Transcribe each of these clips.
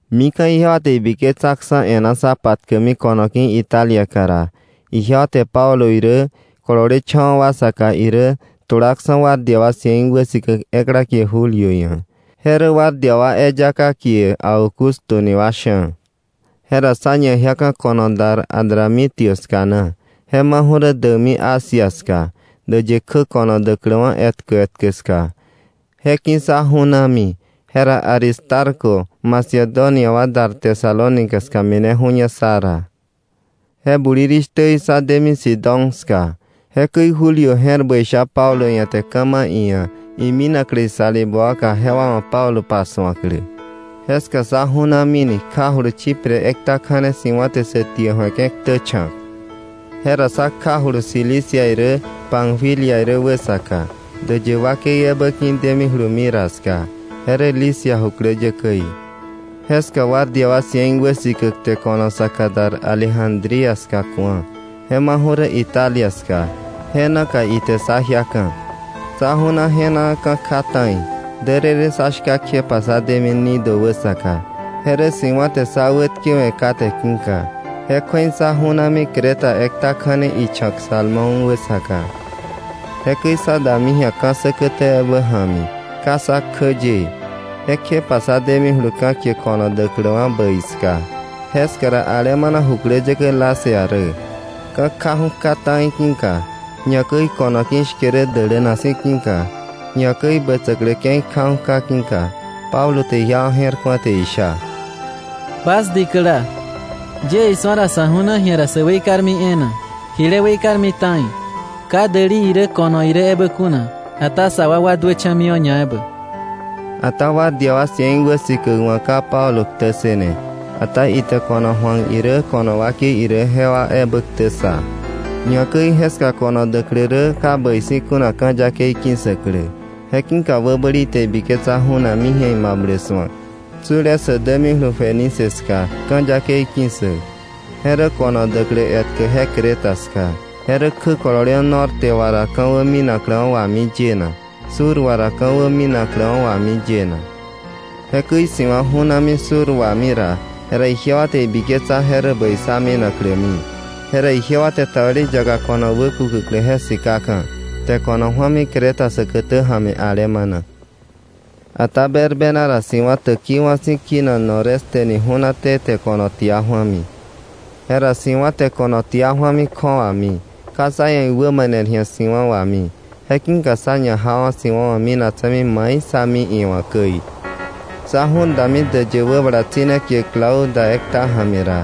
Mika̱ ijewa te ibiketsaksa̱ e̱ná sá patkäkmi ko̱no ki̱ Italiaka ra, ijewa te Pablo irä, kololecha̱wa̱ wa saka irä, tulaksa̱ guardia wa cien wäsikäk ekla kie Julio ia̱. Je rä guardia wa eyaka wa kie Augusto ni wa sha̱. Jera sá ñajiaka̱ ko̱no dar Adramitio ska na, je maju̱ rä däkmi Asia ska, däyë kjä ko̱no däkläwa̱ etkä etkä ska. Je ki̱ sá ju̱nami. Jera Aristarco Macedonia wa dar Tesalónica ska mineju̱ña sá ra. Je bulirishtäí sá demi Sidón ska. Jekäi Julio je̱r bäi sha Pablo ia̱ te ka̱ ma̱ iia̱ iminaklä isalibä waka jewa wa̱ Pablo pasu̱aklä. Jeska sá ju̱namini, kjajulu Chipre ekta kja̱ne si̱wa̱ te sä tie ju̱eke̱ ktä cha̱k. Jera sá kjajulu Cilicia irä, Panfilia irä wäsaka, däyë wakei ebä ki̱ demijulu Mira ska, je rä Licia jukläyäkäí. Jeska guardia wa cien wäsikäk te ko̱no saka dar Alejandría ska ku̱a, je maju̱ rä Italia ska, je naka ite sá jiaka̱. Sá ju̱na je̱naa, ka̱ kja ta̱i, därërë sá shka kjepa sá demi Gnido wäsaka, je rä si̱wa̱ te sá wätkewe̱ kate ki̱ka, je kju̱ei sá ju̱nami Creta ekta kja̱ne icha̱k Salmón wäsaka. Jekäi sá dami ji̱a ka̱ säkätä ebä ja̱mi, ka sä kjä yee. Jekjepa sá demijulu ka̱ kie Ko̱no Däkläwa̱ Bäi ska. Jeska ra alemana jukläyäkä Lasea rä. Ka̱ kjaju̱ kja ta̱i ki̱ka, ñakäi ko̱no ki̱ shke rä däläna si̱ ki̱ka, ñakäi bätsäklä ke̱i kjaju̱ kja ki̱ka, Pablo te ijewa je̱r ku̱a te isha: —Bas dikäla, yie isu̱a ra, sa̱ ju̱na ji̱a ra sä weikarmi e̱e̱na, jile weikarmi ta̱i, ka däli irä, ko̱no irä ebä kuna, ata sa wakwa duächa̱miwa̱ ñaebä. Ata guardia wa cien wäsikäk wa̱ ka Pablo ktä ssëne, ata ite ko̱no ju̱ak irä ko̱no wakei irä jewa ebä ktä ssa. Ñakäi jeska ko̱no däklä rä ka bäi si̱ kuna, ka̱ yakei ki̱ssäklä. Je ki̱ka wäbäli te ibiketsa ju̱nakmi ji̱a imablä su̱ak, tsule sä dämijulu Fenice ska, ka̱ yakei ki̱ssäk. Je rä ko̱no däklä etkä, je Creta ska. Je rä kjä kololewa̱ norte wà ra ka̱wä minakläwa̱ wami yena, sur wà ra ka̱wä minakläwa̱ wami yena. Jekäi si̱wa̱ ju̱nami sur wami ra, jera ijewa te ibiketsa je rä bäi sá minaklämi. Jera ijewa te tabeli yaka ko̱no wäkukäklä je sikaka̱, te ko̱no ju̱ami Creta säkätä ja̱mi alemana. Ata berbena ra si̱wa̱ täkiwa̱ si̱ kinak noreste ni ju̱naté te ko̱no tia ju̱ami. Jera si̱wa̱ te ko̱na tia ju̱ami kju̱awami, ka sá ia̱ iwämaner ji̱a si̱wa̱ wami. Je ki̱ka sá ñajawa̱ si̱wa̱wa̱ minaktse̱mi mai sá mi iwa̱ käi. Sá ju̱r dami däyë wäbala tsi̱ne kie Clauda ekta ja̱mi ra,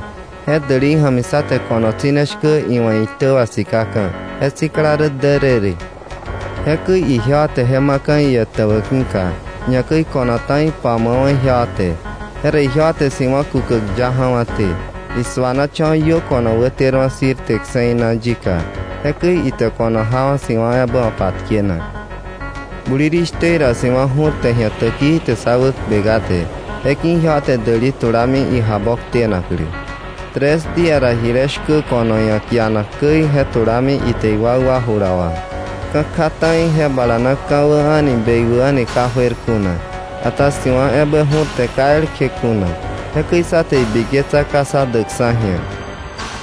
je dälei ja̱mi sá te ko̱no tsi̱ne shkä iwa̱ iitä wa sikaka̱, je sikla rä därërë. Jekäi ijewa te je ma̱ka̱ ietäbä ki̱ka, ñakäi ko̱no ta̱i pamu̱awa̱ ijewa te. Jera ijewa te si̱wa̱ kukäk ya ja̱wa̱té, isu̱anacha̱wa̱ iö ko̱no wäterwa̱ Sirte kse̱i naka yika. Jekäi ite ko̱no jawa̱ si̱wa̱ ebä wa̱ patkenak. Bulirishtä ra si̱wa̱ ju̱rte ji̱a täkii te sá wäkpe kate. Je ki̱ka ijewa te däli tulami ijaboktenaklä. Tres día ra jile shkä ko̱no ia̱ kianak käi je tulami ite iwakwa jula wà. Ka̱ kja ta̱i je bala na ka̱wä a̱ni bekwä a̱ni ka juer kuna, ata si̱wa̱ ebä ju̱rte ka elkje kuna. Jekäi sá te ibiketsa ka sá däkksa̱ ji̱a.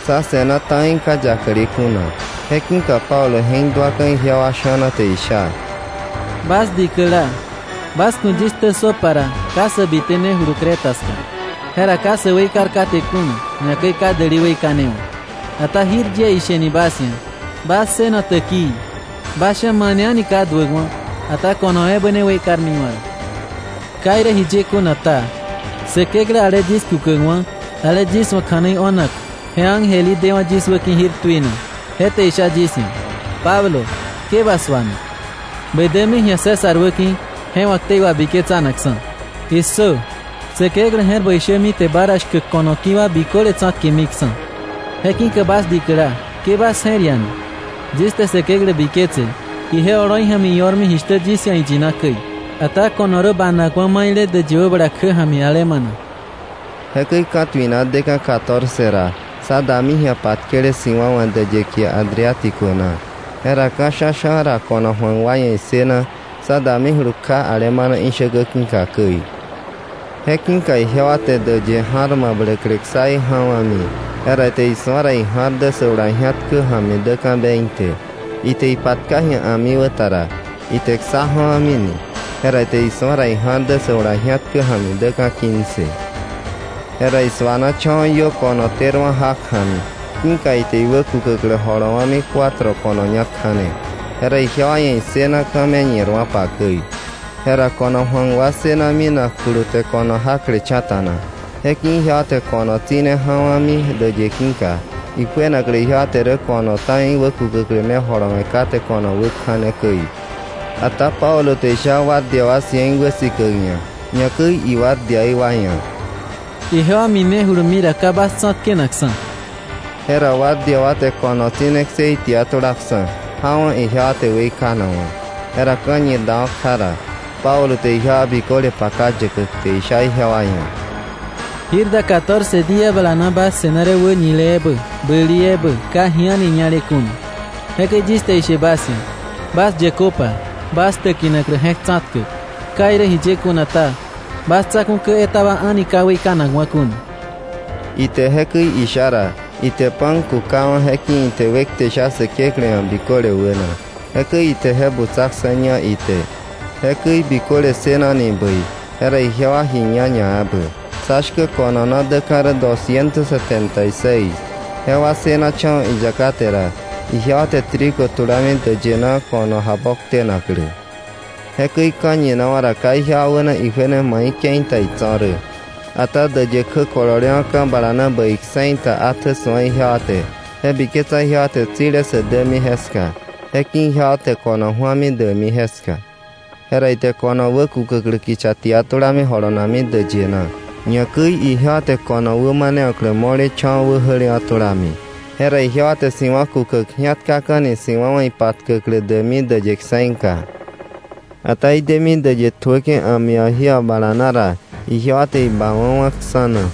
Sá se̱na ta̱i ka yakle kuna. Je ki̱ka Pablo je̱k duaka̱ ijewa sha̱na te isha: —Bas dikäla, bas ku̱ yis ktä ssöpa ra, ka sä bitenejulu Creta ska, jera ka sä weikar kate kuna, ñakäi ka däli weikanewa̱. Ata jir yie isheni bas ia̱, bas ssëno täkii. Bas sha̱ mane a̱ni ka duäkwa̱, ata ko̱no ebä ne weikarmiwa̱ rä. Ka irä jiye kuna ta, Säkeklä ale yis kukäkwa̱, ale yis wa̱ kja̱nei o̱nak je ángel í dewa̱ yis wäki̱ jir tuina, je te isha yis ia̱: “Pablo, ke ba su̱ana. Bä dämi ji̱a César wäki̱ je wa̱ ktei wabiketsanakksa̱. Issö, Säkeklä je̱r bäi shämi te ba ra shkäk ko̱no ki̱ wa biköle tsa̱tkemiksa̱.” Je ki̱ka bas dikäla, ke bas je̱r iana, yis te Säkeklä biketse, ije oloi ja̱mi io̱rmi jishtä yis ia̱ iyina käi. Ata ko̱no rä banakwa̱ maile däyë wäbala kjä ja̱mi alemana. Jekäi ka̱tuina deka̱ catorce ra, sá dami ji̱a patkele si̱wa̱ wa̱ däyë kie Adriático na. Jera ka̱ sha̱sha̱ ra ko̱no ju̱akwa ia̱ issëna, sa damijulu kja alemana ishäkä ki̱ka käi. Je ki̱ka ijewa te däyë ja̱r mabläklä ksaí ja̱wa̱mi, jera ite isu̱a ra ija̱r dä sä jula ji̱atkä ja̱mi däka̱ veinte. Ite ipatka ji̱a a̱miwäta ra, ite ksá ja̱wa̱mini, jera ite isu̱a ra, ija̱r dä sä jula ji̱atkä ja̱mi däka̱ quince. Jera isu̱anacha̱wa̱ iö ko̱no terwa̱ jak ja̱mi, ki̱ka ite iwäkukäklä jolowa̱mi cuatro ko̱no ñak kja̱ne. Jera ijewa ia̱ issëna ka̱ me ñirwa̱pa käi. Jera ko̱no ju̱ak wa ssëna minakjulu te ko̱no jaklecha̱ta̱na. Je ki̱ka ijewa te ko̱no tsi̱ne ja̱wa̱mi däyë ki̱ka, ijuenaklä ijewa te rä ko̱no ta̱i wäkukäklä ne jolowe̱ kate ko̱no wä kja̱ne käi. Ata Pablo te isha guardia wa cien wäsikäk ia̱, ñakäi iguardiaí wa ia̱: —Ijewa minejulumi ra, ka bas tsa̱tkenakksa̱. Jera guardia wa te ko̱no tsi̱ne ksei tia tulaksa̱, jawa̱ ijewa te weikanakwa̱. Jera ka̱ñir dawa̱ kja ra, Pablo te ijewa biköle paka yäkäk, te isha ijewa ia̱: —Jir da catorce día bala na bas se̱na rä wäñile ebä, bäli ebä, ka ji a̱ni ñale kuna. Jekäi yis te ishe bas ia̱, bas yäköpa, bas täkinaklä je̱k tsa̱tkäk. Ka irä jiye kuna ta, bas tsa̱ku̱ kä etaba a̱ni ka weikanakwa̱ kuna. Ite jekäi isha ra, ite pan kukawa̱, je ki̱ ite wekte sha Säkeklä ia̱ biköle wäna. Jekäi ite je butsaksa̱ ña ite. Jekäi biköle ssënani bäi, jera ijewa ji ña ñaebä. Sá shkä ko̱no na däka̱ rä dosciento setenta y seis. Jewa ssëwa̱cha̱wa̱ iyaka te ra, ijewa te trigo tulami däyë na ko̱no jaboktenaklä. Jekäi ka̱ñinawa̱ ra ka ijewa wäna ijuene mai ke̱i ta itso̱ rä. Ata däyë kjä kololewa̱ ka̱ bala na bäi kse̱i ta atjä su̱a ijewa te, je biketsa ijewa te tsile sä dämi jeska, je ki̱ka ijewa te ko̱no ju̱ami däkmi jeska. Jera ite ko̱no wäkukäklä kicha tia tulami jolonakmi däyë na. Ñakäi ijewa te ko̱no wämanewa̱klä mo̱lecha̱wa̱ wäjälewa̱ tulami. Jera ijewa te si̱wa̱ kukäk ji̱atkaka̱ni si̱wa̱ wà ipatkäklä däkmi däyë kse̱ika. Ata idemi däyë tjuäke̱ a̱mi wà jí wà bala na ra, ijewa te ibawa̱wa̱ ksa̱ na.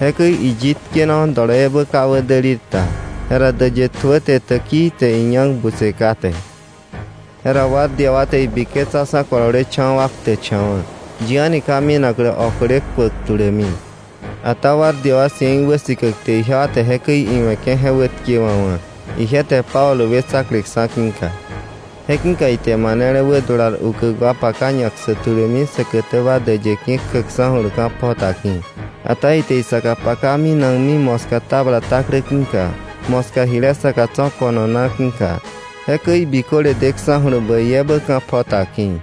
Jekäi iyik tkenawa̱ doloiebä ka wädälir ta, jera däyë tjuäte täkii te iñak butse kate. Jera guardia wa te ibiketsaksa̱ kololecha̱wa̱ wa ktäkcha̱wa̱, yi a̱ni ka minaklä okle tkuäk tulämi. Ata guardia wa cien wäsikäk te ijewa te jekäi iwe̱ke̱ je wätkewa̱wa̱, ije te Pablo wetsakleksa̱ ki̱ka. Je ki̱ka ite manele wädular ukäk wa paka ñapsäk tulämi säkätäba däyë ki̱ kjäksa̱julu ka̱ pjota ki̱. Ata ite isaka paka minakmi moska tabla taklä ki̱ka, moska jile saka tso̱ ko̱no na ki̱ka. Jekäi biköle deksa̱julu bäi ebä ka̱ pjota ki̱.